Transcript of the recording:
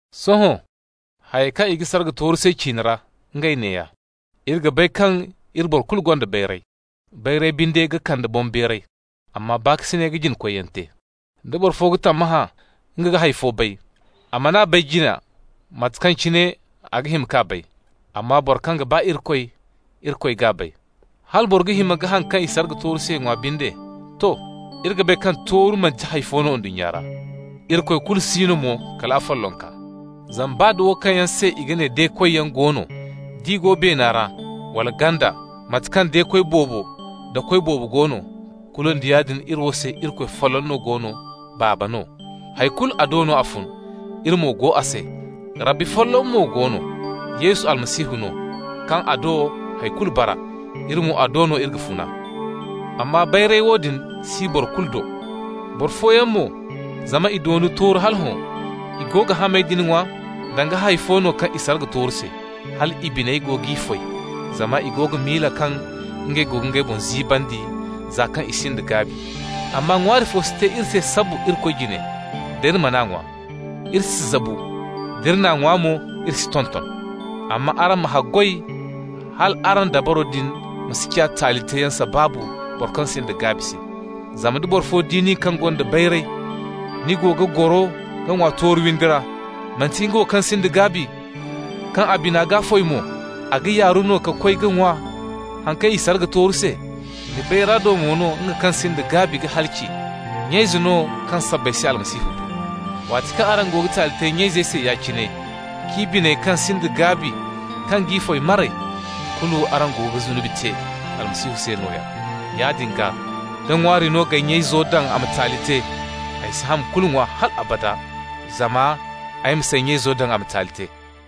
Sohõ, hayey kaŋ i ga sarga tooru se ciine ra, ngey neeya: Iri ga bay kaŋ iri boro kulu gonda bayray. Bayray binde ga kande boŋbeeray, amma baakasinay ga jina-koyyaŋ te. Da boro fo ga tammahã nga ga hay fo bay, a man'a bay jina mate kaŋ cine a ga hima k'a bay. Amma boro kaŋ ga ba Irikoy, Irikoy g'a bay. Hala boro ga hima ka haŋ kaŋ i sarga tooru se ŋwa binde, to: iri ga bay kaŋ tooru manti hay fo no ndunnya ra. Irikoy kulu si no mo kala afollonka. Zama baa da wo kaŋ yaŋ se i ga ne de-koyyaŋ go no, d'i go beena ra, wala ganda, mate kaŋ de-koy boobo da koy boobo go no, kulu nda yaadin iri wo se Irikoy folloŋ no go no, Baaba no. Hay kulu, a do no a fun, iri mo go a se. Rabbi folloŋ mo go no, Yesu Almasihu no, kaŋ a do hay kulu bara. Iri mo, a do no iri ga funa. Amma bayray woodin si boro kulu do. Boro fooyaŋ mo, zama i doona tooru hala hõ, i go ga hamey din ŋwa danga hay fo no kaŋ i sarga tooru se, hal i biney go g'i foy zama i go ga miila kaŋ ngey go ga ngey boŋ ziibandi, za kaŋ i sinda gaabi. Amma ŋwaari fo si te iri se sabbu Irikoy jine. Da iri man'a ŋwa, iri si zabu. D'iri n'a ŋwa mo, iri si tonton. Amma araŋ ma haggoy hal araŋ dabaro din ma si ciya taali teeyaŋ sabaabu boro kaŋ sinda gaabi se. Zama nda boro fo di nin kaŋ gonda bayray, ni go ga goro ka ŋwa tooru windi ra, manti nga wo kaŋ sinda gaabi kaŋ a bina g'a foy mo, a ga yaaru no ka koy ka ŋwa haŋ kaŋ i sarga tooru se? Ni bayra do mo no, nga kaŋ sinda gaabi ga halaci, nya-ize no kaŋ sabbay se Almasihu bu. Waati kaŋ araŋ go ga taali te nya-izey se ya-cine, k'i biney kaŋ sinda gaabi kaŋ g'i foy maray, kulu araŋ go ga zunubi te Almasihu se nooya. Yaadin gaa, da ŋwaari no g'ay nya-izo daŋ a ma taali te, ay si ham kulu ŋwa hal abada, zama ay ma s'ay nya-izo daŋ a ma taali te.